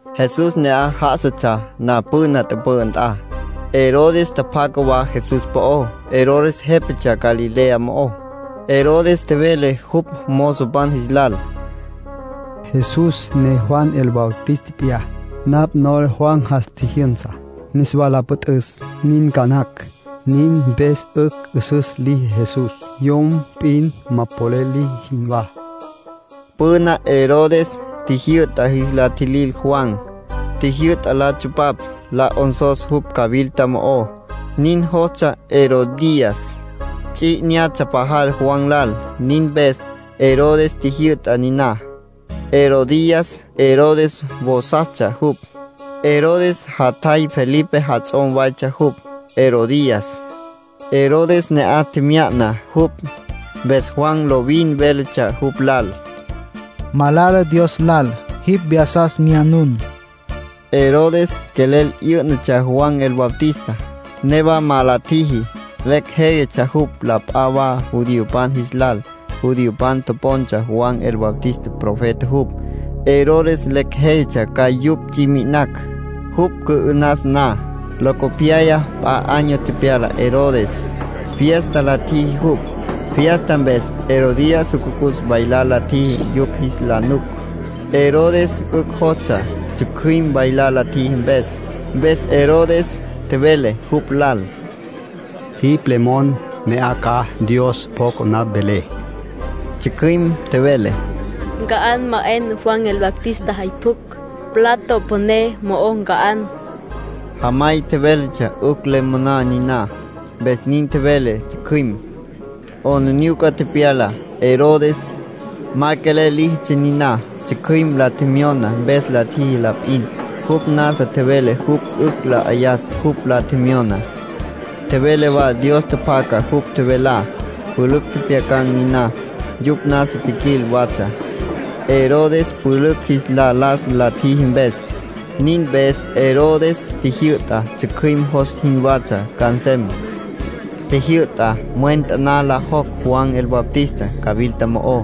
Jesús ne'aj já'asatsja na püna tüpü'ü nt'a, Herodes tjapjaca wa Jesús po'ó. Herodes jépatsja Galilea mo'ó. Herodes tjevele jupj mozopan jis lal: “Jesús ne Juan el Bautista p'iyá. Napj nola Juan jas tjijyünsa, niswa la püt'üs. Nin ca nacj. Nin mpes 'ücj 'üsüs liji Jesús, yom p'in ma polel liji jinwá”, tjevele jupj. Püna Herodes tjijyü'ta jis la tjilil Juan. Tjijyü'ta la tsupapj, la 'onsos jupj cawilta mo'ó. Nin jostsja Herodías. Ts'i 'inyatsja pajal Juan lal. Nin mpes Herodes tjijyü'ta niná. Herodías Herodes vosastsja jupj. Herodes jatjay Felipe jats'om waytsja jupj, Herodías. Herodes ne'aj tjemya'na jupj. Mpes Juan lovin véletsja jupj lal: “Malala Dios lal jipj vyasas myanun”. Herodes quelel 'yǘ'natsja Juan el Bautista, newa ma la tjiji. Lecj jéyatsja jupj la p'a wa judiopan jis lal. Judiopan topontsja Juan el Bautista profeta jupj. Herodes lecj jéyatsja ca yupj ts'i mi'inacj, jupj cü'ü'nas na. Locopyaya p'a año tepyala Herodes. Fiesta la tjiji jupj. Fiesta mpes Herodías jucucus bailar la tjiji yupj jis la nuc. Herodes 'ücj jostsja tsjücjüim bailar la tjiji mpes. Mpes Herodes tjevele jupj lal: —Jipj le mon, mya 'a ca. Dios pjoca napj velé. Tsjücjüim tjevele: —Nca'an ma 'en Juan el Bautista jay pjucj. Plato püné mo'o nca'an. Jamay tjevéletsja 'ücj le moná niná, mpes nin tjevele tsjücjüim. 'Aplijila tepyala Herodes. Ma quelel líjitsja niná; tsjücjüim la tjemyona mpes la tjiji la p'in. Jupj nasa tjevele jupj 'ücj la 'ayas jupj la tjemyoná. Tjevele wa Dios tjapjaca jupj tjevelá. Pülücj tjepjyacan̈ niná. Yupj nasa tjiquil watsja, Herodes pülücj jis la las la tjiji mpes. Nin mpes Herodes tjijyü'ta tsjücjüim jos jinwatsja ca nsem. Tjijyü'ta mwen taná la jocj Juan el Bautista cawilta mo'ó.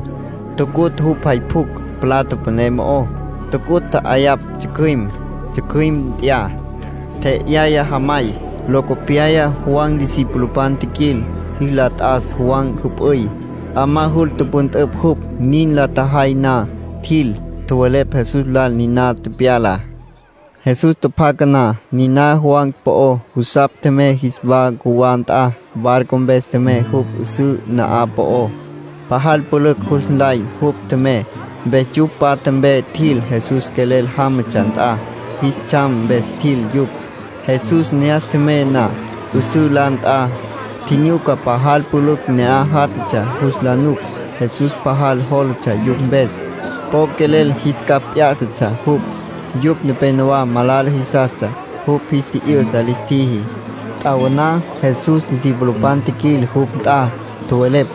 Tucutj jupj jay pjucj plato püné mo'ó. Tucutj, tja'ayapj tsjücjüim. Tsjücjüim nt'ya, tje'yaya jamay. Locopyaya Juan discipulopan tjiquil, jis la t'as Juan jüp'üy. 'Amá jul tüpüntüpj jupj. Nin la tjajay na, tjil, tjowelepj Jesús lal niná tepyalá. Jesús tjapjaca na niná Juan po'ó, jusapj tjemey jis wa cjuwá nt'a. Barco mpes tjemey jupj 'üsǘ na'aj po'ó. Pajal pülücj jus nlay jupj tjemey, mpes yupj patja mpe tjil Jesús quelel jámatsja nt'a. Jis tsjam mpes tjil yupj. Jesús ne'as tjemey na 'üsǘ la nt'a, tjinyuca pajal pülücj ne'aj játjatsja jus la nuc. Jesús pajal jólatsja yupj mpes. Po quelel jis capj p'yá'satsja jupj. Yupj nepenowá malala jisastsja. Jupj jis tji'yü'sa lis tjiji. T'awaná Jesús discipulopan tjiquil jupj nt'a. Tjowelepj: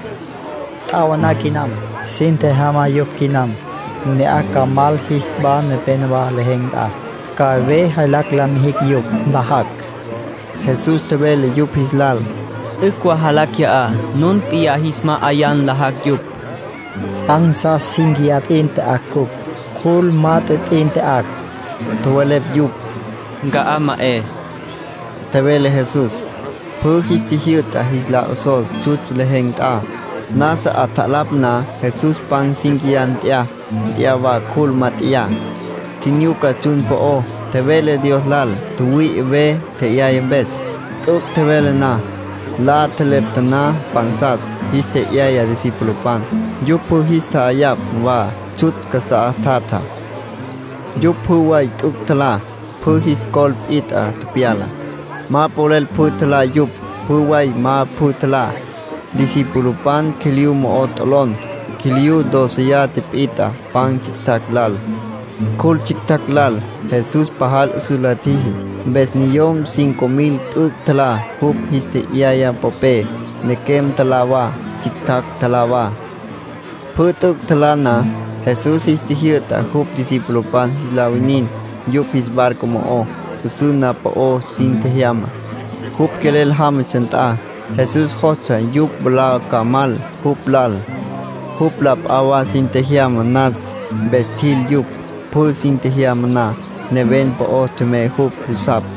—T'awaná quinam. Sin tjejyama yupj quinam, ne'aj ca mal jis wa nepénowa lejen̈ nt'a. Ca ve jaylacj la mijicj yupj, nlajacj. Jesús tjevele yupj jis lal: —'Ücj wa jalá qui'á. Nun p'iyá jis ma'ayá nlajacj yupj. —Pansas cínquiya p'in tya'acj cupj. Cjul mat'e p'in tya'acj —tjowelepj yupj. —Nca'á ma 'e —tjevele Jesús. Pjü jis tjijyü'ta jis la 'osos tsjutsj lejen̈ nt'a. Nasa 'atjalapj na, Jesús pan cínquiya nt'ya. Nt'ya wa cjul mat'eyá. Tjinyuca tsjun po'ó, tjevele Dios lal tjüwüi'i ve tje'yaya mpes. T'üc' tjevele na, la tjelepta taná pansas. Jis tje'yaya discipulopan. Yupj pjü jis tja'ayapj wa tsjutsj casá tjatjá. Yupj pjü way t'üc' tjalá. Pjü jis col pit'a tepyala. Ma polel pjü tjalá yupj. Pjü way ma pjü tjalá, discipulopan quiliyú mo'o t'olon. Quiliyú dóceya tipit'a pan tsjictjacj lal, cjul tsjictjacj lal. Jesús pajal 'üsüs la tjiji, mpes niyom cinco mil t'üc' tjalá jupj jis tje'yaya popé. Nequem tjalá wa, tsjictjacj tjalá wa. Pjü t'üc' tjalá na, Jesús jis tjijyü'ta jupj discipulopan jis la winin yupj jis barco mo'ó. 'Üsǘ na'aj po'ó sin tjejyama, jupj quelel jámatsja nt'a. Jesús jostsja yupj mwalá ca mal jupj lal, jupj la p'a wa sin tjejyama nas. Mpes tjil yupj. Pjü sin tjejyama na, neven po'ó tjemey jupj jusapj,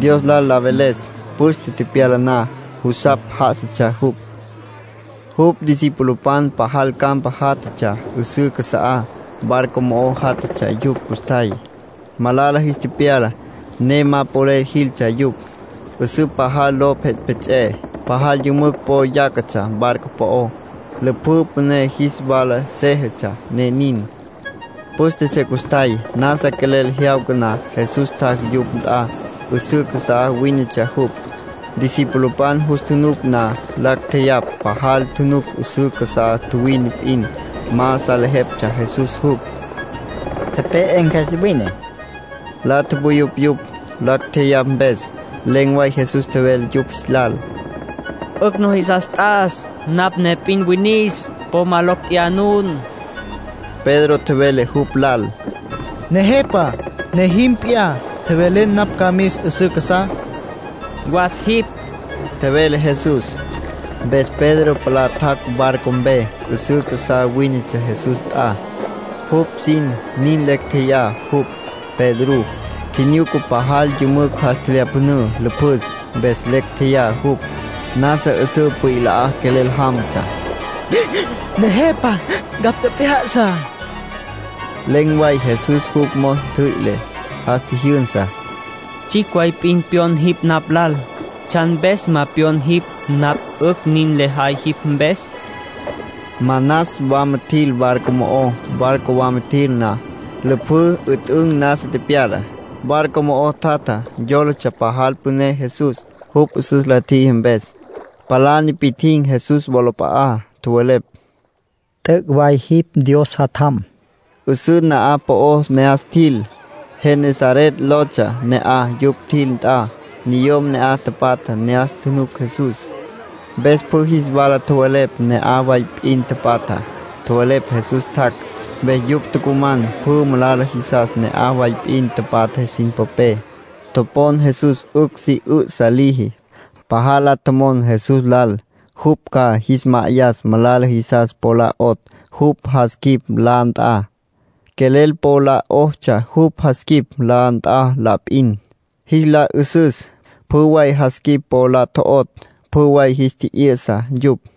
Dios lal la veles. Püste tepyala na, jusapj já'asatsja jupj. Jupj discipulopan pajal campa játjatsja 'üsǘ casa'á. Barco mo'o játjatsja yupj custjay. Malala jis tepyala, ne ma polel jiltsja yupj. 'Üsǘ pajal lo pjets'epjets'e. Pajal yümücj po yácatsja barco po'ó. Lüpjǘ püné jis wala séjetsja, ne nin. Pǘstetsja custjay. Nasa quelel jyawca na, Jesús tjac' yupj nt'a. 'Üsǘ casá wínetsja jupj. Discipulopan jus tjunuc na, lacj tjeyapj pajal. Tjunuc 'üsǘ casá tjuwine p'in. Ma salejeptsja Jesús jupj. —Tepe'e cjües wine —tjowelepj yupj. La tupuyupj yupj, lacj tjeyapj mpes. Len̈ way Jesús tjevele yupj jis lal: —'Ücj nujisas t'as. Napj ne p'in winis. Po ma locj tjeyá nun. Pedro tjevele jupj lal: —Nejepa, ne jim p'iyá, tjevele napj ca mis 'üsǘ casá. —Was jipj —tjevele Jesús. Mpes Pedro palá tjac' barco mpe. 'Üsüs casá wínetsja Jesús nt'a. Jupj sin nin lecj tjeyá jupj, Pedrú. Tjinyuca pajal yümücj jas tjelyapjünǘ lüpjüs, mpes lecj tjeyá jupj. Nasa 'üsǘ pwila quelel jámatsja. —Nejepa, ncapj tjep'ya'sa —tjevele jupj. Len̈ way Jesús jupj mos ntjüi'le. Jas tjijyünsa. —Tsjicj way p'in pyon jipj napj lal —tjevele Jesús Pedro lal—. ¿Tsjan mpes ma pyon jipj napj 'ücj nin lejay jipj mpes? —tjevele. Manas wama tjil barco mo'ó. Barco wama tjil na, lüpjǘ 'üt'ün nasa tepyala. Barco mo'o tjatjá yólatsja pajal püné Jesús, jupj 'üsüs la tjiji mpes. Palá nipi'tjin̈ Jesús wolap'a'á. Tjowelepj: —T'üc' way jipj Dios Jatjam. 'Üsǘ na'aj po'ó ne'as tjil. Genesaret lotsja ne'aj, yupj tjil nt'a. Niyom ne'aj tapatjá ne'as tjunuc Jesús. Mpes pjü jis wala tjowelepj ne'aj way p'in tapatjá. Tjowelepj Jesús tjac'. Mpes yupj tucuman pjü malala jisas ne'aj way p'in tapatja sin popé. Topon Jesús 'ücj si 'ü'sa liji. Pajal la tjomon Jesús lal jupj ca jis ma'ayas malala jisas po la 'otj jupj jas quip la nt'a. Quelel po la 'otsja jupj jas quip la nt'a la p'in, jis la 'ü'süs. Pjü way jas quip po la tjo'otj, pjü way jis tji'yü'sa yupj.